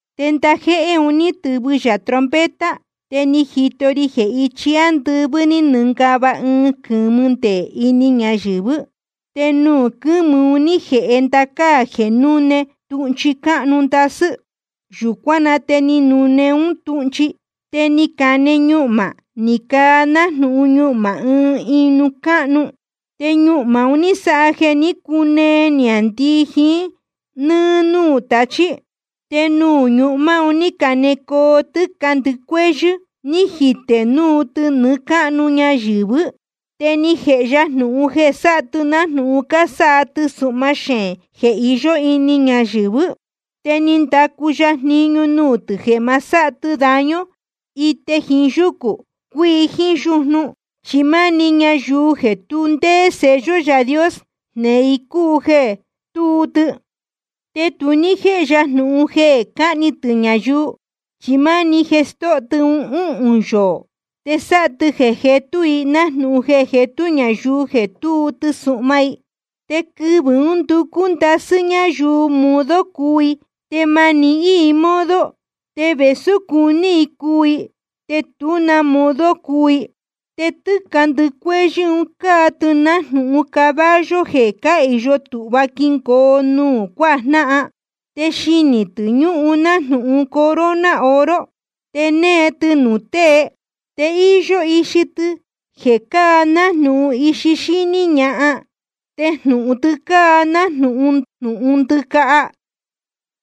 Te ndajéhé uhūn ni tɨvɨ yā trompeta. Te ni jito ri jeē ichi ándɨvɨ́ ní nɨngava ɨɨn quɨ̄mɨ nde ini ñayɨ̄vɨ́. Te nuū quɨ́mɨ un ní jēhe ndacáa jeē núne tūhnchi cúnú ndasɨ́. Yūcuán na te ni nune un túhnchi, te ni cane ñuhmā ni caa nájnūhun ñuhmā ɨɨn ijnū cáhnu. Te ñuhmā un ní sáha jeē ní cunee niāndii jiín nɨ́ɨ́ núū tachí. Te nuū ñuhmā un ní canecoo tɨ́ca ndɨcuéhyɨ́, ni jitē núu tɨ nɨɨ́ cáhnu ñayɨ̄vɨ́. Te ni jēhe ya jnūhun jeē sáha tɨ nájnūhun cásáha tɨsuhma xeēn jeē iyó ini ñayɨ̄vɨ́. Te ni ndacu ya jniñu nuū tɨ̄ jeē ma sáha tɨ daño ite jiín yúcū cuíi jíín yujnu, chi máni ñayuu jeē tu ndéé sello Yaā Dios jneē i cúu jeē tuu tɨ. Te tu ní jéhe ya jnūhun jeē cáhni tɨ̄ ñayuu, chi máni jeē stóho tɨ i uhūn yoō. Te sáha tɨ jeē jetú i nájnūhun jeē jetú ñayuu jeē túu tɨsuhma i. Te quɨvɨ̄ ún nducú ndasɨ́ ñáyuu modo cuu i, te ma nihín i modo. Te vēsú cuní i cuu i, te tú na modo cuu i. Te tɨ́ca ndɨcuéhyɨ́ un cáa tɨ nájnūhun caballo jeē cáhīyo tūhva quingoo nuū cuájnáhan. Te xinī tɨ̄ ñúhun nájnūhun corona oro. Te née tɨ nuū tée. Te íyó ixi tɨ jeē cáa nájnūhun ixi xíní ñahan. Te jnūhun tɨ cáa nájnūhun jnūhun ndɨcaha.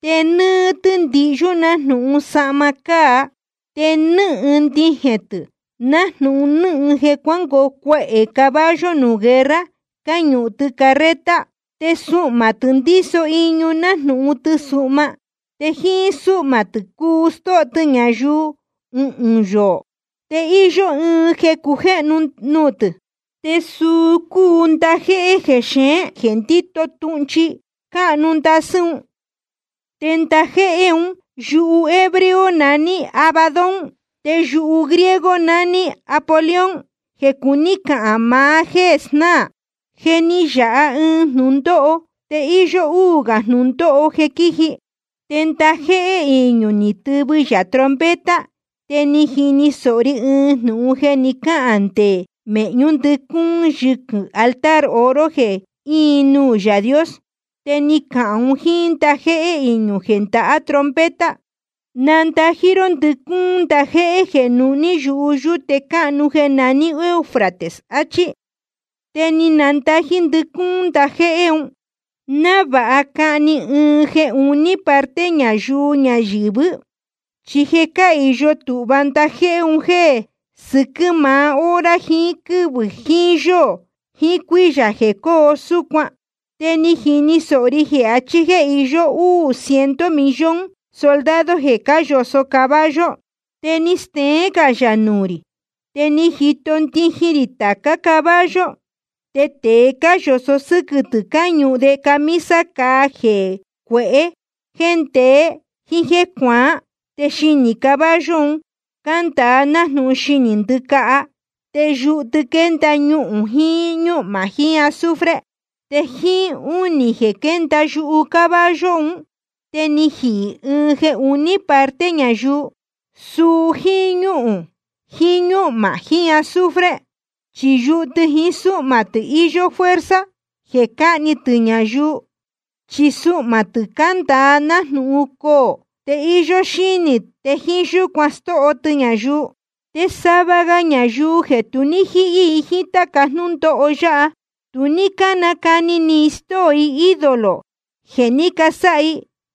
Te nɨ́ɨ́ tɨ́ ndihyú nájnūhun sahma cáa. Te nɨ́hɨn ndijēn tɨ̄ nájnūhun nɨ́hɨn jeē cuángoo cuehē caballo nuū guerra cáñuhun tɨ carreta. Te suhmā tɨ̄ ndíso iñu nájnūhun tɨsuhma. Te jíín súhmā tɨ̄ cuu stóho tɨ ñayuu uhūn yoō. Te íyó ɨɨn jeē cujéhnu nuū tɨ̄, te suu cúu ndajéhé jexeén jeē ndíto tūhnchi cúnú ndasɨ́ un. Te ndajéhé un yuhu hebreo naní Abadón, te yuhu griego naní Apolión, jeē cuní cahān maá jéē snáā. Je ni yāha ɨɨn jnūndóho, te íyó úū gā jnūndóho jeē quíji. Te ndajéhé iñū ni tɨvɨ yā trompeta. Te ni jini sōho ri ɨɨn jnūhun jeē ni cáhān nde mēhñú ndɨcúún yɨquɨ̄ altar oro jeē íin nuū Yaā Dios. Te ni cahān un jíín ndajéhé iñū jeē ndahá trompeta: Nandají ró ndɨcúún ndajéhé jeē nuhní yuhu yúte cáhnu jeē naní Eufrates, achí. Te ni nandajī ndɨcúún ndajéhé un, návāha cahni ɨɨn jeē uní parte ñayuu ñayɨ̄vɨ́. Chi je cáhīyo tūhva ndajéhé un jeē sɨquɨ́ maá hora jiín quɨ́vɨ̄ jiín yóō jiín cuíyā jeē cóo súcuan. Te ni jini sōho ri jeē achí jéē iyó úū ciento millón soldado jeē cáyoso caballo. Te ni steén gā yā nuū rī, te ni jito ndijin rī tācá caballo. Te tēe cáyoso sɨquɨ̄ tɨ̄ cáñuhun de camisa cāa jeē cuehé, jeē ndeé, jíín jéē cuaán. Te xinī caballo un cándāa nájnūhun xinī ndɨ́caha. Te yuhu tɨ quénda ñuhūn jiín ñúhmā jiín azufre. Te jíín únī jeē quénda yuhu caballo un, te ni jihī ɨɨn jeē uní parte ñayuu, suu jíín ñúhūn jiín ñúhmā jiín azufre. Chi yuhu tɨ jiín súhmā tɨ̄ iyó fuerza jeē cáhni tɨ̄ ñayuu. Chi suhmā tɨ̄ cándāa nájnūhun coō, te íyó xínī, te jíín yúcuan stóho tɨ ñayuu. Te sava ga ñayuu jeē tu ní jíhí jiín táca jnúndóho yáha, tu ní nácani ni i stóo i ídolo jeē ní casáha i.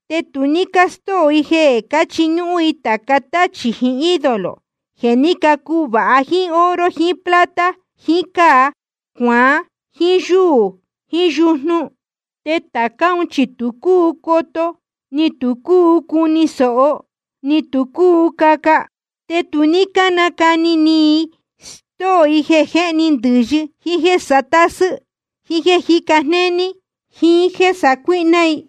Te tu ní stóo i jeē cáchiñúhún i tāca táchī jiín ídolo jeē ní cuvāha jíín oro jiín plata jiín cáa cuaán jiín yúū jiín yujnu. Te tācá un chi tu cúu coto, ni tu cúu cuni sōho, ni tu cúu caca. Te ni tu ní cánacani ni i stóo i jeē jéhni i ndɨ̄yɨ, jíín jéē satásɨ́ i, jíín jéē jíca jnéní i, jíín jéē sacuíhná i.